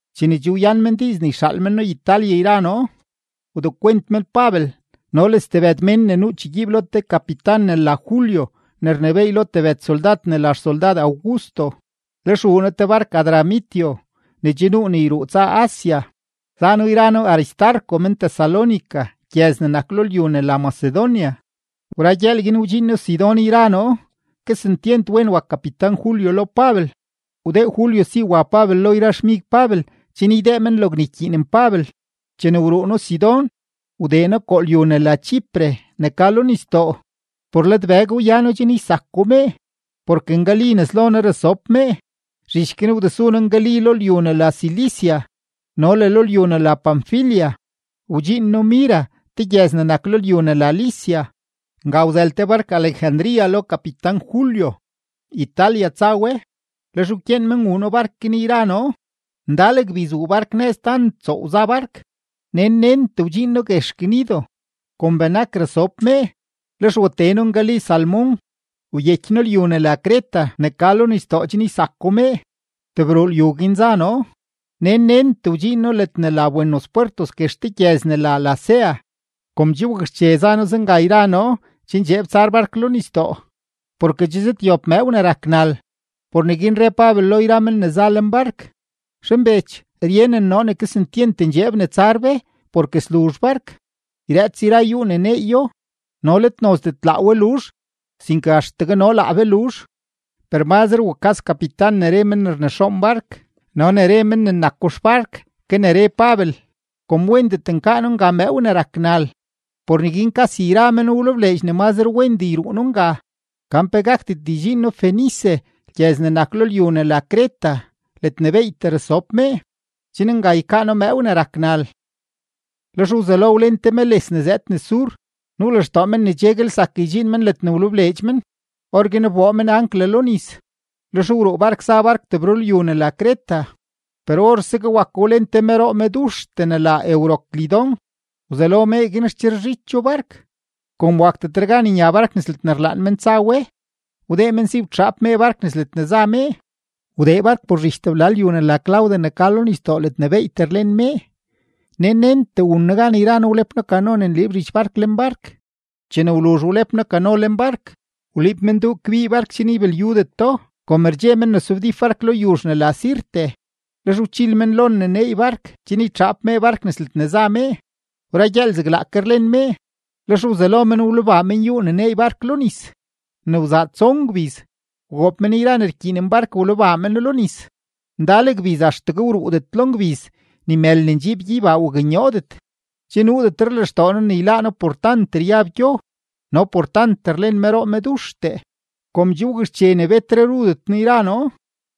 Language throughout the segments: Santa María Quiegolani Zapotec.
Chene che wyan men diiz ne yxaal men noo Italia yra noo, wdekwent men Pabel no le stebëd mén ne nuu chegyiib lo te kapitan ne la Julio ne rnebééy lo tebëd soldad ne la xsoldad Augusto. Lex wuu noo te bark-Adramitio ne che nuu ne yruu tsa Asia. Za noo yra noo Aristarco men-Tesalónica gyëz ne nak lo lyu ne la Macedonia. Wra gyëël guin wdxiin noo Sidón yra noo; kesentyent wen wak kapitan-Julio lo Pabel, wdee Julio si wa Pabel lo yra xmig Pabel chen ydee men logne ykyiinen Pabel. Chene wruu noo Sidón, wdee noo koo lyu ne la Chipre ne ka lo nisdoo, por lad bëg wyano chen ysako mee, porke ngali nes lo noo rasob mee. Zhich guin wdesu noo ngali lo lyu ne la Cilicia no le lo lyu ne la Panfilia, wdxiin noo Mira te gyëz ne nak lo lyu ne la Licia. Nga wzël te bark-Alejandría lo kapitan-Julio, Italia tsa we; lex wkyeen men wuu noo bark guin yra noo. Ndal gbiz wuu bark nëz tant tsoow za bark, nen nentee wdxiin noo guex Gnido. Kom benak rasob mee, lex watee noo ngali Salmón, wyeky noo lyu ne la Creta ne ka lo nisdoo chen ysako mee. Tebrulyu guin za noo; nen nentee wdxiin noo ledne la Buenos Pwertos guex te gyëz ne la Lasea. Kom che wakxche za noo zenga yra noo, che ndxeeb tsar bark lo nisdoo, porke che zëdyob mëëw ne rak nal. Por neguin re Pabel lo men yra men ne za lenbark: ―Zhanbech, ryenen noo ne kesentyent ndxeeb ne tsar be, porke sluzh bark, yrëëts yra yúú ne neeyo, no let nozdet laa we luzh, sinke axtegue no laa be luzh. Per mazre wukas kapitan ne re men ne rnexoon bark no ne re men nako xbark ke ne re Pabel. Kom wendet nkaa noo nga mëëw ne rak nal, por neguin kasi yra men wlebleedx ne mazre wendee yruu noo nga, gan pe gakdet ydxiin noo Fenice gyëz ne nak lo lyu ne la Creta ledne beeytee rasob mee, chen nga ykaa noo mëëw ne rak nal. Lex wzelo wlen te meles ne zëëd nes sur, nuu lextoo men ne cheguel zak ydxiin men ledne wlebleedx men. Orguin wboo men ancla lo nis, lex wruu bark za bark tebrulyu ne la Creta. Per orsegue wako wlen te meroo meduxtee ne la Euroclidón, wzelo mee guin rcherezhicho bark. Kom wakdetre gan nya bark nes ledne rlaan men tsa we, wdee men si wtxaap mee bark nes ledne za mee. Wdee bark por zhich tebla lyu ne la Clauda ne ka lo nisdoo ledne beeytee rlen mee, nen nentee wun noo gan yra noo wlep noo kano ne nliib zhich bark lenbark. Chene wluzh wlep noo kano lenbark, wliib men duu kbii bark chen ybilyudeto. Kom rdxe men ne sobdíp bark lo yuzh ne la Sirte, lex wchil men lon ne neey bark, chen ytxaap mee bark nes ledne za mee. Wra gyëël zeglaake rlen mee, lex wzelo men wlebaa men yúú ne neey bark lo nis. Ne wzaa tson gbiz, wgoob men yra ne rkyiinen bark wlebaa meno lo nis. Ndal gbiz axtegue wruudet lo ngbiz, ni mël ne ndxiib gyeybaa waknyoodet; che nuudetre lextoo noo ne yláá noo por tant ryab gyo no por tant rlen meroo meduxtee. Kom che wakxche ne betre rudet noo yra noo,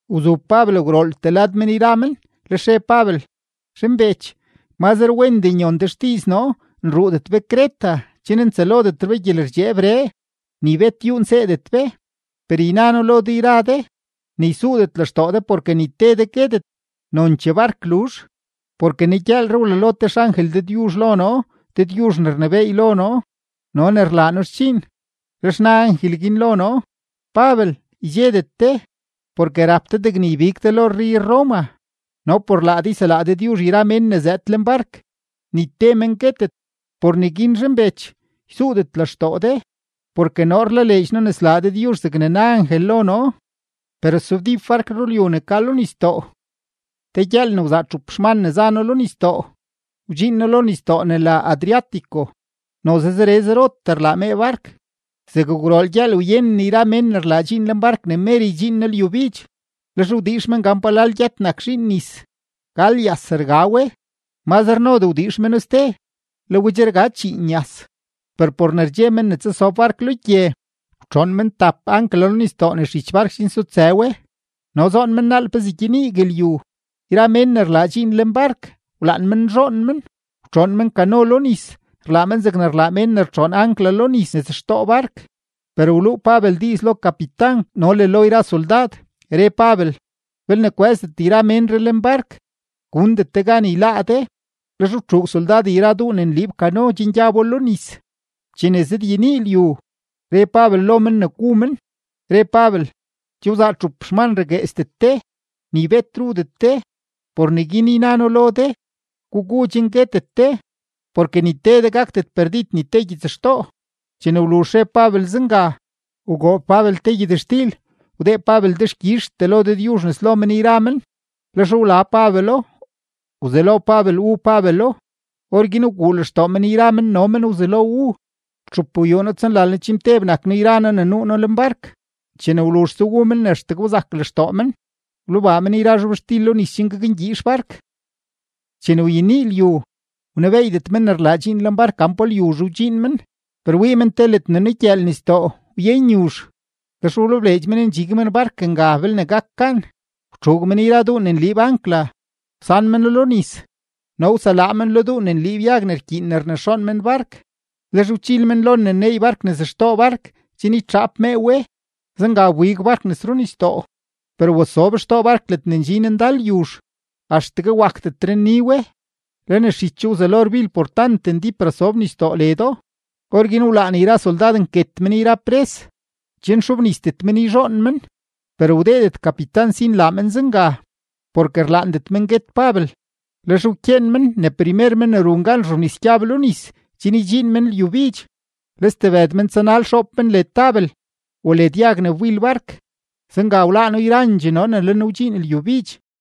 wzu Pabel gwrooltee lad men yra men, lex re Pabel: ―Zhanbech, mazre wendee nyon de xdiiz noo nruudet be Creta chen ntsëlodet be gyelerdxeebree, ni bet yúú nseedet be. Per yna noo lo de yra de, ne ysuudet lextoo de porke ni te de guetet, nonchee bark luzh. Porke negyëëlree wlalo te xangel Dëdyuzh lo noo, Dëdyuzh ne rnebééy lo noo no ne rlaa noo xdxiin. Lex na angel guin lo noo: “Pabel, ydxedet de, porke rap de degne ybig de lo rrey-Roma no por laa de yselaa Dëdyuzh yra mén ne zëëd lenbark, ni te men guetet.” Por neguin zhanbech, ysuudet lextoo de, porke noo rlaleedx noo ne slaa Dëdyuzh zegne na angel lo noo; per sobdíp bark rulyu ne ka lo nisdoo. Te gyëël ne wzaa txup xman ne za noo lo nisdoo, wdxiin noo lo nisdoo ne la Adriático, noze zere zerotee rlaa mee bark. Zeg gwrool gyëël wyenen yra mén ne rlaa dxiin lenbark ne mer ydxiin noo lyubidx. Lex wdiix men gan palal gyët nak zhiin nis, gal yas rga we; mazre nodee wdiix meno ste, le we che rga chíín yas. Per por ne rdxe men ne tsasob bark lo gye, wtxoon men tap ancla lo nisdoo nes zhich bark chen sutsë we, no zoon men naal pezee gyeniigue lyu. Yra mén ne rlaa dxiin lenbark, wlaan men nzhoon men; wtxoon men kano lo nis, rlaa men zegne rlaa men ne rtxoon ancla lo nis nes xtoo bark. Per wluu Pabel diiz lo kapitan no le lo yra soldad, re Pabel: ―Belne kwë́zdet yra ménree lenbark, gundet de gan yláá de. Lex wtxuug soldad yra duu ne nliib kano chen gyabo lo nis. Chene zëdyenii lyu, re Pabel lo men ne gu men, re Pabel: ―Che wzaa txup xman ragueesdet de, ni bet rudet de. Por neguin yna noo lo de, gugu chen guetet de, porke ni te de gakdet perdid ni te gyitsxtoo. Chene wluzh re Pabel zenga, wgoob Pabel te gyëtxtil, wdee Pabel dexkyizhtee lo Dëdyuzh nes lo men yra men. Lex wla Pabelo, wzelo Pabel wu Pabelo. Orguin wguu lextoo men yra men no men wzelo wu. Txupgwyuuno-tsonlalno-chimteb nak noo yra noo ne nuu noo lenbark. Chene wluzhse wu men ne axtegue wzak lextoo men, wlebaa men yra zhobxtil lo nis chen gakngyiix bark. Chene wyenii lyu, wnebeeydet men ne rlaa dxiin lenbark gan pa lyuzhe wdxiin men, per wii men te ledne nugyëël nisdoo, wyen yuzh, lex wlebleedx men ndxig men bark nga belne gak gan. Wtxuug men yra duu ne nliib ancla, wsan meno lo nis, no wseláá men lo duu ne nliib yag ne rkyiin ne rnexoon men bark. Lex wchiil men lon ne neey bark nes xtoo bark chen ytxaap mee we, zenga wbig bark nes runisdoo. Per wasob xtoo bark ledne ndxin ndal yuzh, axtegue wakdetre nni we, le nes zhicho wzelo rbil por tant ndíp rasob nisdoo ledo. Orguin wlaan yra soldad nket men yra pres, chen xobnisdet men yzhoon men. Per wdeedet kapitan si nlaa men zenga, porke rlaandet men guet Pabel. Lex wkyeen men ne primer men ne run gan rzhobnis gyab lo nis chen ydxiin men lyubidx, le stebëd men tsanal, xoob men led tabel o led yag ne wbil bark. Zenga wláá noo yrandxee noo ne le noo wdxiin lyubidx.